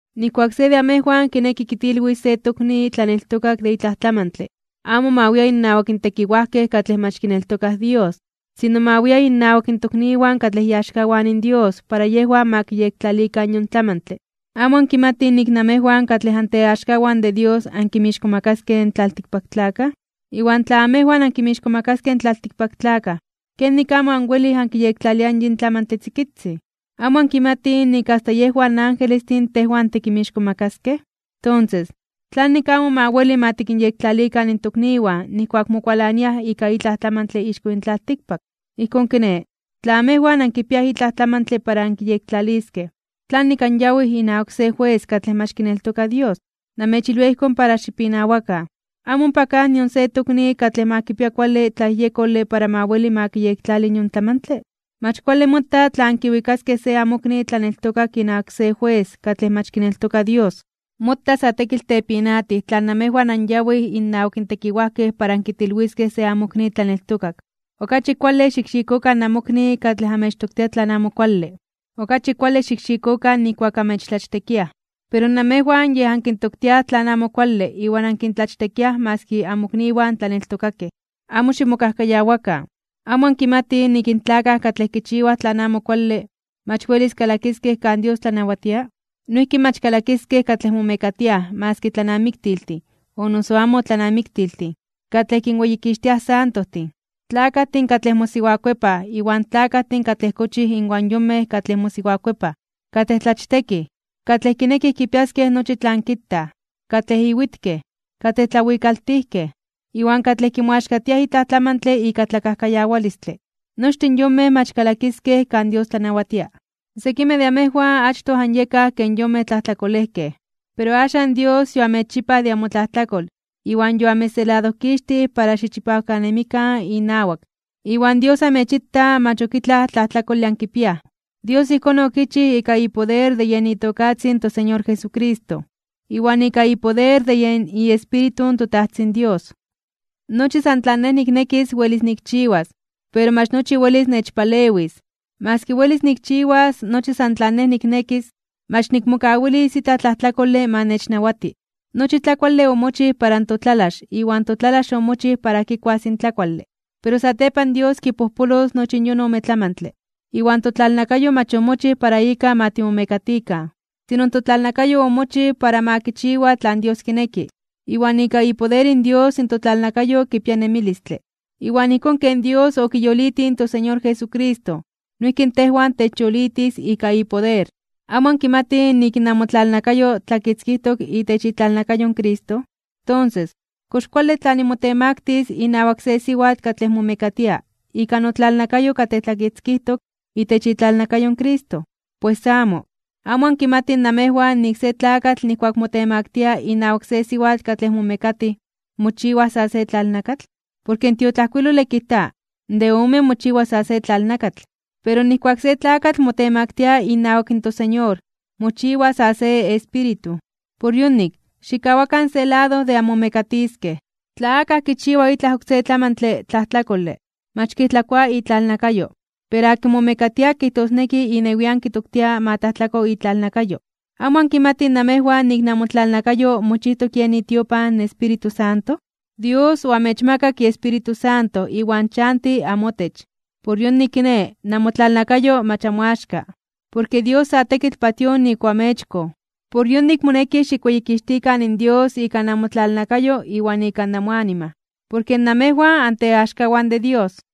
Nijkuak se de amejwan kineki kitilwis se tokni tlaneltokak de itlaj tlamantle, amo ma wia innawak tekiwajkej katlej mach kineltokaj Dios. Sino ma wia innawak tokniwan katlej iaxkawan in Dios para yejwan ma kiyektlalikan yon tlamantle. ¿Amo ankimatij nik namejwan katlej anteaxkawan de Dios ankinmixkomakaskej (ankintzonmanaskej) in tlaltikpaktlakaj? Iwan tla amejwan ankinmixkomakaskej in tlaltikpaktlakaj, ¿kenik amo anwelij ankiyektlaliaj yin tlamantle tzikitzin? ¿Amo ankimatij nik asta yejwan in angelestin tejwan tikinmixkomakaskej? Tonses, ¿tlanik amo ma weli ma tikinyektlalikan in tokniwan nijkuak mokualaniaj ika itlaj tlamantle ixko yin tlaltikpak? Ijkón kiné, tla amejwan ankipiaj itlaj tlamantle para ankiyektlaliskej, ¿tlanik anyawij inawak se jues katlej mach kineltoka Dios? Namechilwia ijkón para xipinawakan. ¿Amo ompa kaj nion se tokni katlej ma kipia kuale tlayejyekole para ma weli ma kiyektlali yon tlamantle? Mach kuale mota tla ankiwikaskej se amokni tlaneltokak inawak se jues katlej mach kineltoka Dios. Mota sa tekitl tepinatij tla namejwan anyawij innawak tekiwajkej para ankitilwiskej se amokni tlaneltokak. Okachi kuale xikxikokan namokni katlej amechtoktia tlan amo kuale. Okachi kuale xikxikokan nijkuak amechtlachtekiaj. Pero namejwan yej ankintoktiaj tlan amo kuale iwan ankintlachtekiaj maski amokniwan tlaneltokakej. Amo ximokajkayawakan. ¿Amo ankimatij nik in tlakaj katlej kichiwaj tlan amo kuale, mach welis kalakiskej kan Dios tlanawatia? Noijki mach kalakiskej katlej momekatiaj maski tlanamiktiltin o noso amo tlanamiktiltin, katlej kinweyikixtiaj in santojtin, tlakajtin katlej mosiwakuepaj iwan tlakajtin katlej kochij inwan yonmej katlej mosiwakuepaj, katlej tlachtekij, katlej kinekij kipiaskej nochi tlan kitaj, katlej iwitkej, katlej tlawikaltijkej, iwan katlej kimoaxkatiaj itlaj tlamantle ika tlakajkayawalistle. Nochtin yonmej mach kalakiskej kan Dios tlanawatia. Sekimej de amejwan achtoj anyekaj ken yonmej tlajtlakolejkej. Pero axan Dios yoamechchipaj de amotlajtlakol iwan yoamechseladojkixtij para xichipawkanemikan inawak, iwan Dios amechita mach ok itlaj tlajtlakole ankipiaj. Dios ijkón okichij ika ipoder de yen itokatzin in toSeñor Jesucristo, iwan ika ipoder de yen iEspíritu in toTajtzin Dios. Nochi san tlan nej niknekis welis nikchiwas. Pero mach nochi welis nechpalewis. Maski welis nikchiwas nochi san tlan nej niknekis, mach nikmokawilis itlaj tlajtlakole ma nechnawati. Nochi tlakuale omochij para totlalax iwan totlalax omochij para kikuas in tlakuale, pero satepan Dios kipojpolos nochi yon ome tlamantle. Iwan totlalnakayo mach omochij para ika ma timomekatikan. Sino in totlalnakayo omochij para ma kichiwa tlan Dios kineki, iwan ika ipoder in Dios in totlalnakayo kipia nemilistle. Iwan ijkón ken Dios okiyolitij in toSeñor Jesucristo, noijki in tejwan techyolitis ika ipoder. ¿Amo ankimatij nik namotlalnakayo tlakitzkijtok itech itlalnakayo in Cristo? Tonses, ¿kox kuale tla nimotemaktis (nimotemaktilis) inawak se siwatl katlej momekatia ika notlalnakayo katlej tlakitzkijtok itech itlalnakayo in Cristo? Pues amo. ¿Amo ankimatij namejwan nik se tlakatl nijkuak motemaktia inawak se siwatl katlej momekatij, mochiwaj sa se tlalnakatl? Porke in tiotlajkuilole kijta: “De omen mochiwa sa se tlalnakatl.” Pero nijkuak se tlakatl motemaktia inawak toSeñor, mochiwa sa se espíritu. Por yonik, xikkawakan se lado de anmomekatiskej. Tla akaj kichiwa itlaj oksé tlamantle tlajtlakole, mach kijtlakoa itlalnakayo, pero akin momekatia kijtosneki inewian kitoktia ma tlajtlako itlalnakayo. ¿Amo ankimatij namejwan nik namotlalnakayo mochijtok yen itiopan in Espíritu Santo? Dios oamechmakak iEspíritu Santo iwan chanti amotech. Por yonik kiné, namotlalnakayo mach amoaxka. Porke Dios sa tekitl patíoj nik oamechkoj. Por yonik moneki xikweyikixtikan in Dios ika namotlalnakayo iwan ika namoanima, porke namejwan anteaxkawan de Dios.